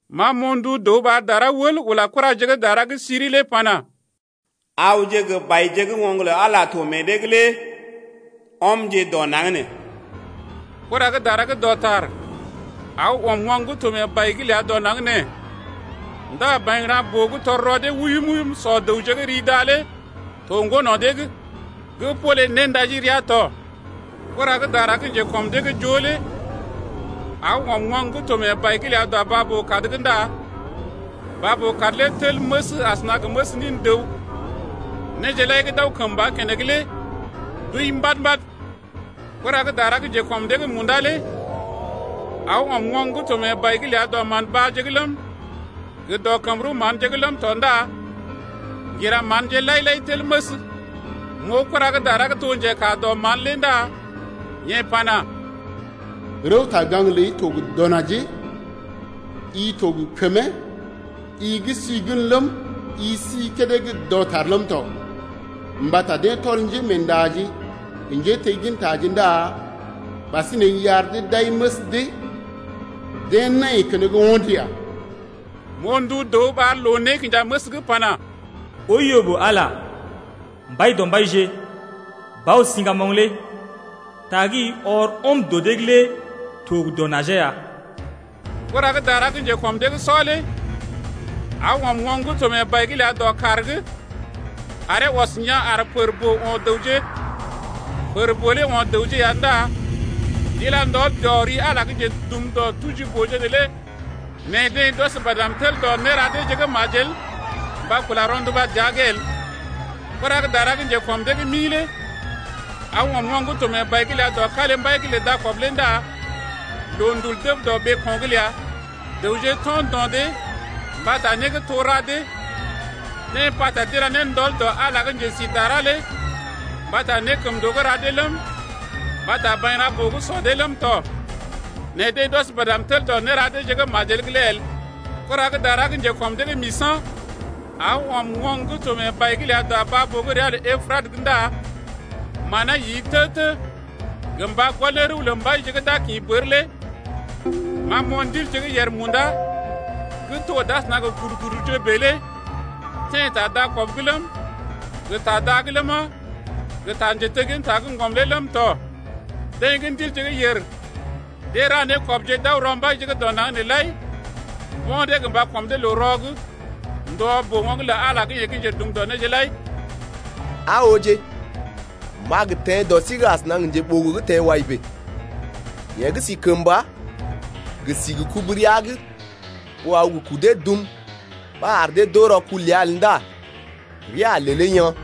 Ma m’oo ndu dəw ɓar dara wəl ula kuraje gə́ dara gə́ siri lé pana: Awje gə baije gə́ oŋg lə Ala to meḛ dee’g lé ɔmje dɔ naŋg nee. Kura gə́ dara gə́ dɔtar aw ɔm oŋg gə́ to mee bai’g ləa dɔ naŋg nee. Ndá bairaŋ-boo gə́ tɔr rɔ dee wuyum-wuyum sɔ dəwje gə́ ri da lé to ŋgo no̰ dee’g gə́ pole néndajirea tɔ. Kura gə́ dara gə́ njekɔm dee’g joo lé aw ɔm oŋg gə́ to mee bai’g ləa dɔ baa-boo-kad’g ndá baa-boo-kad lé tel məs asəna gə məs nin dəw. Néje lai gə́ d’aw kəmba keneŋ lé d’wəi mbad-mbad. Kura gə́ dara gə́ njekɔm dee’g munda lé aw ɔm oŋg gə́ to mee bai’g ləa dɔ mán-baaje’g ləm, gə dɔ kəm-rəw-manje’g ləm tɔ ndá ŋgira manje lai-lai tel məs. M’oo kura gə́ dara gə́ to njekaa dɔ mán lé ndá yeḛ pana: Rəwta-gaŋg ləi to gə dɔ najee, i to gə kəmee, i gə́ si gən ləm, i si kédé gə́ dɔtar ləm tɔ. Mbata deḛ tɔl njémeendaje gə njéteggintaje ndá ɓasinè i ar dee d’ai məs dee. Deḛ nai keneŋ ho̰d ya. M’oo ndu dəw ɓar loo-nékinjaməs’g pana: Oiyo ɓó Ala, Mbaidɔmbaije, Bao-siŋgamoŋ lé ta gə́ i ɔr ɔm dɔ dee’g lé to gə dɔ najee ya. Kura gə́ dara gə́ njekɔm dee’g sɔ lé aw ɔm oŋg gə́ to mee bai’g ləa dɔ kàr’g aree ɔs yaa̰ ar pər-boo o̰ dəwje, pər-boo lé o̰ dəwje ya ndá d’ila ndɔl dɔ ri Ala gə́ njedum dɔ tuji-booje’g neelé. Nɛ deḛ d’ɔs badm tel dɔ néra deeje gə́ majel mba kula rɔnduba dəa’g el. Kura gə́ dara gə́ njekɔm dee’g mi lé aw ɔm oŋg gə́ to mee bai’g ləa dɔ kalimbai’g lə dakɔb lé ndá loondul dəb dɔ ɓeeko̰’g ləa. Dəwje to̰ ndo̰ dee mbata né gə́ too ra dee. Deḛ pata d’ila ne ndɔl dɔ Ala gə́ njesidará lé mbata nékəmndoo gə́ ra dee ləm, mbata bairaŋ-boo gə́ sɔ dee ləm tɔ. Nɛ deḛ d’ɔs badm tel dɔ néra deeje gə́ majel’g lé el. Kura gə́ dara gə́ njekɔm dee’g misa̰ aw ɔm oŋg gə́ to mee bai’g ləa dɔ baa-boo gə́ ria lə Epratə ndá manee yi tə-tə gə mba gɔl ne rəw lə mbaije gə́ d’a gə kḭ bər lé. Ma m’oo ndilje gə́ yèr munda gə́ to d’asəna gə kurkuduje bèe lé teḛ ta dakɔb’g ləm, gə ta da’g ləma, gə ta njetegginta gə́ ŋgɔm lé ləm tɔ. Deḛ gə́ ndilje gə́ yèr, deḛ ra nékɔbje d’aw rɔ mbaije gə́ dɔ naŋg nee’g lai mbo̰ dee mba kɔm dee loo-rɔ’g ndɔ boo-oŋg lə Ala yeḛ gə́ njedum dɔ néje lai lé. Aa ooje, m’a gə teḛ dɔ sí’g asəna gə njeɓogo gə́ teḛ wai bèe. Yeḛ gə́ si kəmba gə si gə kubu rəa’g ɓó aw gə kudee dum ba ar dee d’oo rɔkul ləa el ndá rəa a lelee yaa̰.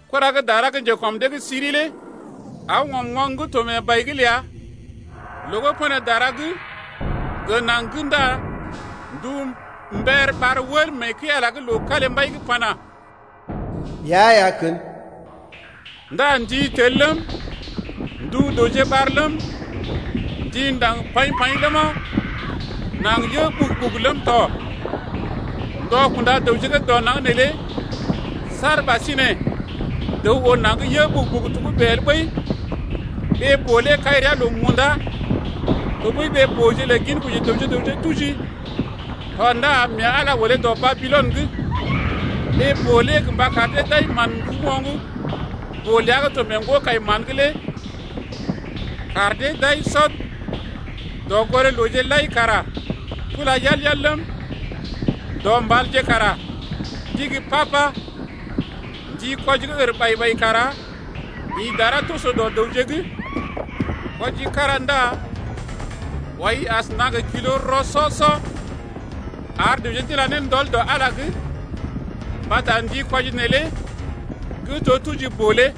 Kura gə́ dara gə́ njekɔm dee’g siri lé aw ɔm oŋg gə́ to mee bai’g ləa loo gə́ pən dara’g gə naŋg’g ndá ndu mbər ɓar wəl mee kəi-Ala’g loo kalimbai’g pana: Ɓea ya kən. Ndá ndi tel ləm, ndu dəwje ɓar ləm, ndi ndaŋg paḭ-paḭ ləma, naŋg yə ɓugu-ɓugu ləm tɔ, ndɔ kunda dəwje gə́ dɔ naŋg neelé saar ɓasinè dəw oo naŋg gə́ yə ɓugu-ɓugu togə́bè el ɓəi. Ɓee-boo lé kai rəa loo munda tɔɓəi ɓee-booje lə ginkoji dəwje gə raŋg tuji tɔ ndá mee Ala olé dɔ Babilɔn’g, ɓee-boo lé mba kar dee d’ai mán-nduú oŋg-boo ləa gə́ to mee ŋgo-kai-mán’g lé kar dee d’ai sɔd. Dɔgoré-looje lai kara tula yal-yal ləm, dɔ mbalje kara d’igi pa-pa. Ndi kwɔji gə́ ər ɓai-ɓai kara ḭ dara toso dɔ dəwje’g. Kwɔji kára ndá wɔi asəna gə nékwɔji kwɔi-lə-né rɔ-sɔ-sɔ, ar dəwje d’ila ne ndɔl dɔ Ala’g mbata ndi kwɔji neelé gə́ to tuji-boo lé.